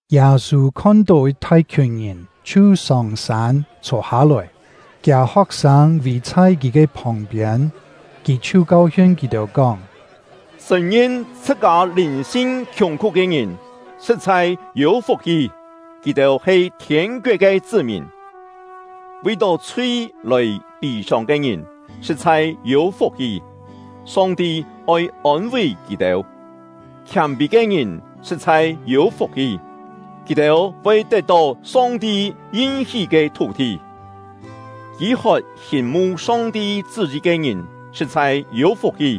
Yâ-sû khon-tó yit thai-khiùn ngìn, chhiu sông-sân, chhô hâ-lòi; kiâ ho̍k-sâng vì chhai kì ke phòng-piên. Kì chhiu kau-hiun kì-têu, kóng: “Sṳ̀n-ngin chhṳ-kâ lìn-sin khiùng-khú ke ngìn sṳ̍t-chhai yû fuk-hi; kì-têu he thiên-koet ke chṳ́-mìn! “Vi-tó chhui lòi pî-sông ke ngìn sṳ̍t-chhai yû fuk-hi; Song-ti oi ôn-ví kì-têu! “Khiâm-pî ke ngìn sṳ̍t-chhai yû fuk-hi; kì-têu voi tet-tó Song-ti yin-hí ke thú-thi! “Kî-hot hiûn-mu Song-ti chṳ́-yi ke ngìn sṳ̍t-chhai yû fuk-hi;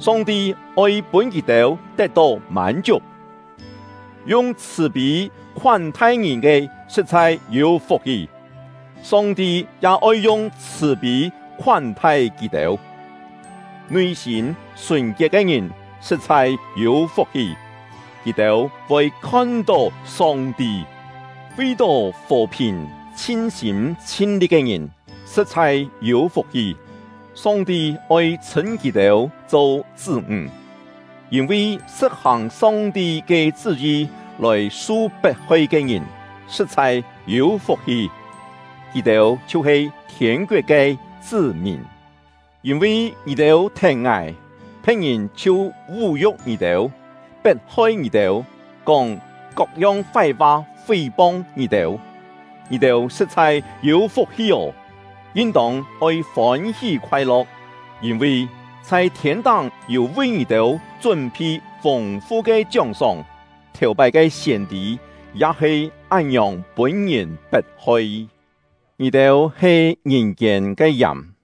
Song-ti oi pûn kì-têu tet-tó mân-chiuk! “Yung chhṳ̀-pî khoán-thai ngìn ke sṳ̍t-chhai yû fuk-hi; Song-ti ya oi yung chhṳ̀-pî khoán-thai kì-têu! “Nui-sîm sùn-kiet ke ngìn sṳ̍t-chhai yû fuk-hi; kì-têu voi khon-tó Song-ti! “Vi-tó fò-phìn chhin-sîm chhin-li̍t ke ngìn sṳ̍t-chhai yû fuk-hi; Song-ti oi chhṳ̂n kì-têu cho chṳ́-ńg! “Yîn-vi sṳ̍t-hàng Song-ti ke chṳ́-yi lòi su pet-hoi ke ngìn sṳ̍t-chhai yû fuk-hi; kì-têu chhiu-he thiên-koet ke chṳ́-mìn! “Yîn-vi ngì-têu thèn ngài, phe̍t-ngìn chhiu vú-yu̍k ngì-têu, pet-hoi ngì-têu, kóng kok-yong fái-fa fí-pong ngì-têu, ngì-têu sṳ̍t-chhai yû fuk-hi ô! Yin-tông oi fôn-hí khoai-lo̍k, yîn-vi chhai thiên-táng yû vi ngì-têu chún-phi fûng-fu ke chióng-sóng; thèu-pái ke siên-tî ya he án-ngiòng pûn-ngìn pet-hoi. “Ngì-têu he ngìn-kiên ke yàm;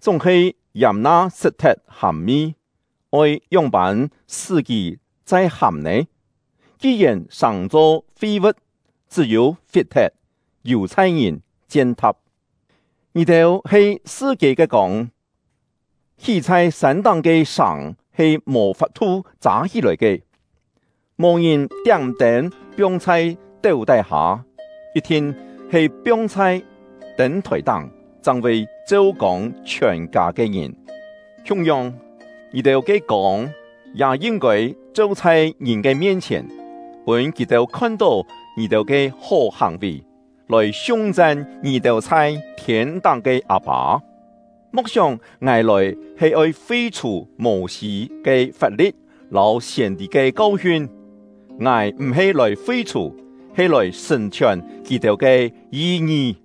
chúng-he yàm na sṳt-thet hàm-mi, oi ngióng-pân sṳ́ kì chai hàm nè? Ki-yèn sàng-cho fi-vu̍t, chṳ́-yû fit-thet, yù-chhai ngìn chien-tha̍p. “Ngì-têu he sṳ-kiên ke kông. Hí chhai sân-táng ke sàng he mò fap-thu châ hí-lòi ke. Mò ngìn tiám-tên piong chhai téu tái-hâ, yit-thin he piong chhai tên-thòi-táng, chang voi cheu-kông chhiòn-kâ ke ngìn. Khiung-yong, ngì-têu ke kông ya yin-kôi cheu chhai ngìn ke mien-chhièn, pûn kì-têu khon-tó ngì-têu ke hó hàng-vì, lòi siung-chan ngì-têu chhai thiên-táng ke Â-pâ. “Mo̍k sióng ngài lòi he oi fi-chhù Mô-sî ke fap-li̍t lâu siên-tî ke kau-hiun. Ngài m̀-he lòi fi-chhù, he lòi sṳ̀n-chhiòn kì-têu ke yi-ngi.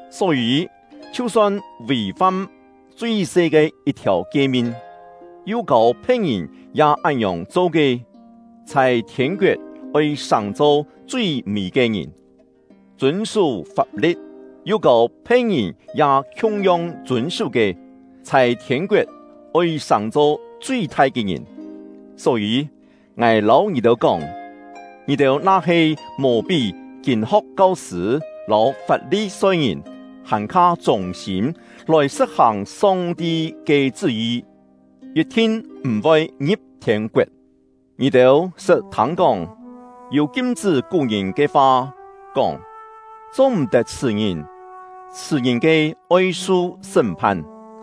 Só-yî, chhiu-son vì-fam chui-se ke yit-thiàu kie-min, yu kâu phe̍t-ngìn ya án-ngiòng cho ke, chhai thiên-koet oi sàng-cho chui-mî ke ngìn. Chûn-sú fap-li̍t, yu kâu phe̍t-ngìn ya khiung-yong chûn-sú ke, chhai thiên-koet oi sàng-cho chui-thai ke ngìn. Só-yî, ngài lâu ngì-têu kóng, ngì-têu na-he mò pí kîn-ho̍k kau-sṳ̂ lâu Fap-li-soi-ngìn hàn-kha chûng-sîm lòi sṳ̍t-hàng Song-ti ke chṳ́-yi, yit-thin m̀-voi ngi̍p thiên-koet. “Ngì-têu sṳt thâng-kóng, yû kim-chṳ́ kú-ngìn ke fa, kóng: ‘Cho-m̀-tet chhṳ̀-ngìn; chhṳ̀-ngìn ke oi su sṳ́m-phan.’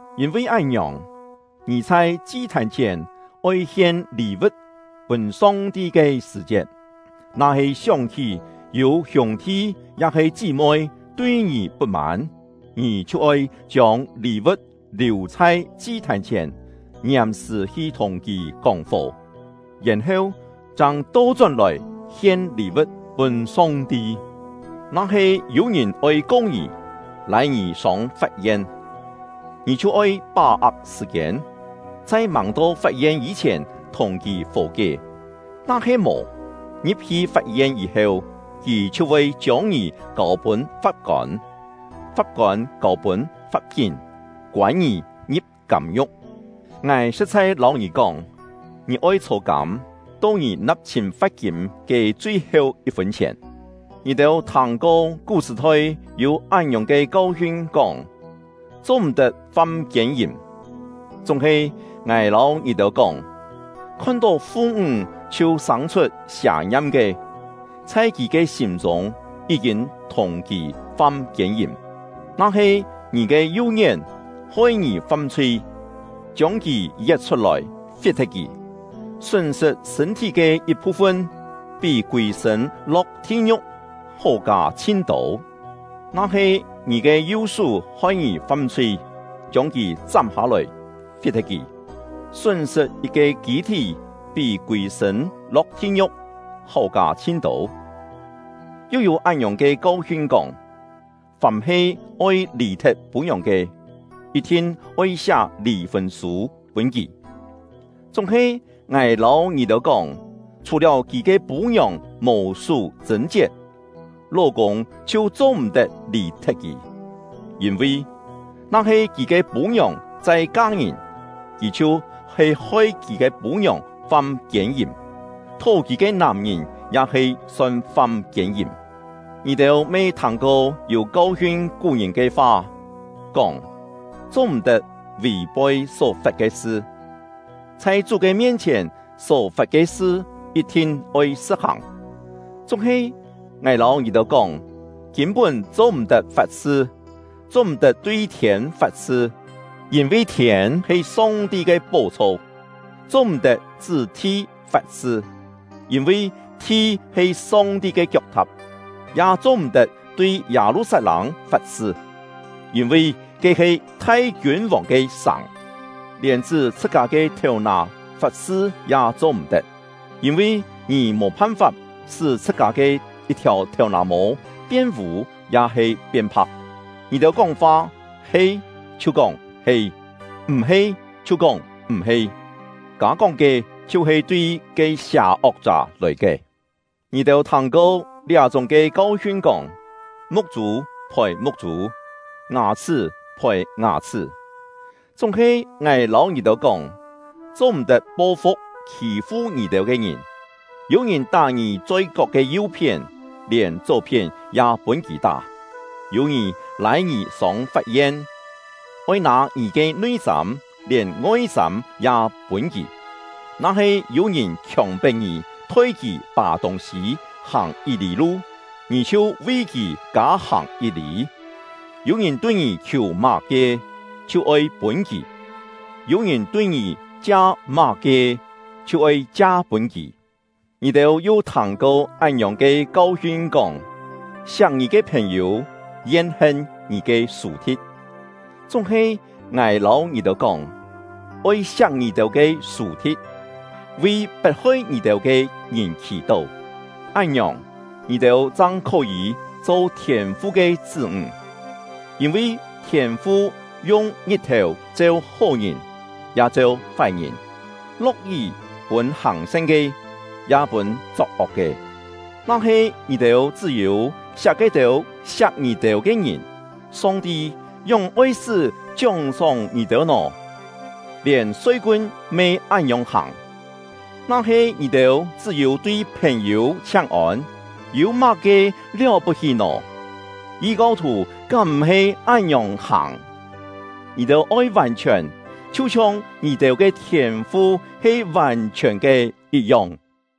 Yîn-vi án-ngiòng, ngì chhai chi-thàn chhièn oi hien lî-vu̍t pûn Song-ti ke sṳ̀-chiet, na-he sióng-hí yû hiûng-thi ya-he chí-moi tui ngì put-mân, ngì chhiu oi chiông lî-vu̍t liù chhai chi-thàn chhièn, ngiàm-sṳ̀ hi thùng kì kóng-fò, yèn-heu chang to-chón-lòi hien lî-vu̍t pûn Song-ti. “Na-he yû-ngìn oi ko ngì, lâi ngì sông fap-yen, ngì chhiu oi pá-ak sṳ̀-kiên, chhai màng-to fap-yen yî-chhièn thùng kì fò-kié. Na-he mò, ngi̍p-hi fap-yen yî-heu, kì chhiu voi chiông ngì kâu-pûn fap-kôn, fap-kôn kâu-pûn fap-kín, koân ngì ngi̍p kâm-ngiu̍k. Ngài sṳ̍t-chhai lâu ngì kóng, ngì oi chhô-kâm, to ngì na̍p-chhîn fa̍t-kîm ke chui-heu yit-fûn chhièn. “Ngì-têu thâng-ko kú-sṳ̀-thoi yû án-ngiòng ke kau-hiun kóng: ‘Cho-m̀-tet fam kiên-yìm.’ Chúng-he ngài lâu ngì-têu kóng, khon-tó fu-ńg chhiu sâng-chhut sià-ngiam ke, chhai kì ke sîm-chûng yí-kîn thùng kì fam kiên-yìm. Na-he ngì ke yu-ngién hoi ngì fam-chhui, chiông kì yet chhut-lòi, fit-thet kì! Sún-sṳt sṳ̂n-thí ke yit-phu-fun pí kûi-sṳ̂n lo̍k thi-ngiu̍k hó kâ chhin-tô. Na-he ngì ke yu-sú hoi ngì fam-chhui, chiông kì chám hâ-lòi, fit-thet kì! Sún-sṳt yit-ke kî-thí pí kûi-sṳ̂n lo̍k thi-ngiu̍k hó kâ chhin-tô. “Yu yû án-ngiòng ke kau-hiun kóng: ‘Fàm-he oi lì-thet pû-ngiòng ke, yit-thin oi siá lì-fûn sû pûn kì.’ Chúng-he ngài lâu ngì-têu kóng, chhù-liáu kì ke pû-ngiòng mò sú chṳ̂n-chiet, ló-kûng chhiu cho-m̀-tet lì-thet kì. Yîn-vi, na-he kì ke pû-ngiòng chai ka-ngìn, kì chhiu-he hoi kì ke pû-ngiòng fam kiên-yìm; thó kì ke nàm-ngìn ya he son fam kiên-yìm. “Ngì-têu me thâng-ko yû kau-hiun kú-ngìn ke fa, kóng: ‘Cho-m̀-tet vì-poi só-fat ke sṳ; chhai Chú ke mien-chhièn só-fat ke sṳ yit-thin oi sṳ̍t-hàng.’ Chúng-he ngài lâu ngì-têu kóng, kîn-pún cho-m̀-tet fat-sṳ. Cho-m̀-tet tui thiên fat-sṳ, yîn-vi thiên he Song-ti ke pó-chho; cho-m̀-tet chṳ́ thi fat-sṳ, yîn-vi thi he Song-ti ke kiok-tha̍p; ya cho-m̀-tet tui Yâ-lu-sat-lâng fat-sṳ, yîn-vi ke he thai Kiûn-vòng ke sàng; lièn chṳ́ chhṳ-kâ ke thèu-nà fat-sṳ ya cho-m̀-tet, yîn-vi ngì mò phan-fap sṳ́ chhṳ-kâ ke yit-thiàu thèu-nà-mô pien-vû ya-he pien-pha̍k. Ngì-têu kóng-fa, he, chhiu kóng ‘He’, m̀-he, chhiu kóng ‘M̀-he’; kâ-kóng ke chhiu-he tui ke sià-ok-chá lòi ke. “Ngì-têu thâng-ko liá-chúng ke kau-hiun kóng: ‘Muk-chû phòi muk-chû, ngà-chhṳ́ phòi ngà-chhṳ́.’ Chúng-he ngài lâu ngì-têu kóng, cho-m̀-tet po-fu̍k khî-fu ngì-têu ke ngìn. Yû-ngìn tá ngì choi-kok ke yu-phién, lièn chó-phién ya pûn kì tá! Yû-ngìn lâi ngì sông fap-yen, oi nâ ngì ke nui-sâm, lièn ngoi-sâm ya pûn kì! Na-he yû-ngìn khiòng-pet ngì thoi kì pà tûng-sî hàng yit-lî lu, ngì chhiu vi kì kâ-hàng yit-lî. Yû-ngìn tui ngì khiù má-ke, chhiu oi pûn kì; yû-ngìn tui ngì chia má-ke, chhiu oi chia-pûn kì. “Ngì-têu yu thâng-ko án-ngiòng ke kau-hiun kóng: ‘Siak ngì ke phèn-yû, yen-hen ngì ke sù-thi̍t.’ Chúng-he ngài lâu ngì-têu kóng, oi siak ngì-têu ke sù-thi̍t, vi pet-hoi ngì-têu ke ngìn khì-tó. Án-ngiòng, ngì-têu chang khó-yî cho Thiên-fu ke chṳ́-ńg. Yîn-vi Thiên-fu yung ngit-thèu cheu hó-ngìn, ya cheu fái-ngìn; lo̍k-yí pûn hàng-san ke, ya pûn chok-ok ke. Na-he ngì-têu chṳ́-yû siak ke-têu siak ngì-têu ke ngìn, Song-ti ngióng oi-sṳ́ chióng-sóng ngì-têu nò? Lièn soi-kun me án-ngiòng hàng. Na-he ngì-têu chṳ́-yû tui phèn-yû chhiáng-ôn, yû má-ke liáu-put-hí nò? Yi-kau-thù kám m̀-he án-ngiòng hàng? Ngì-têu oi vàn-chhiòn, chhiu-chhiong ngì-têu ke Thiên-fu he vàn-chhiòn ke yit-yong.”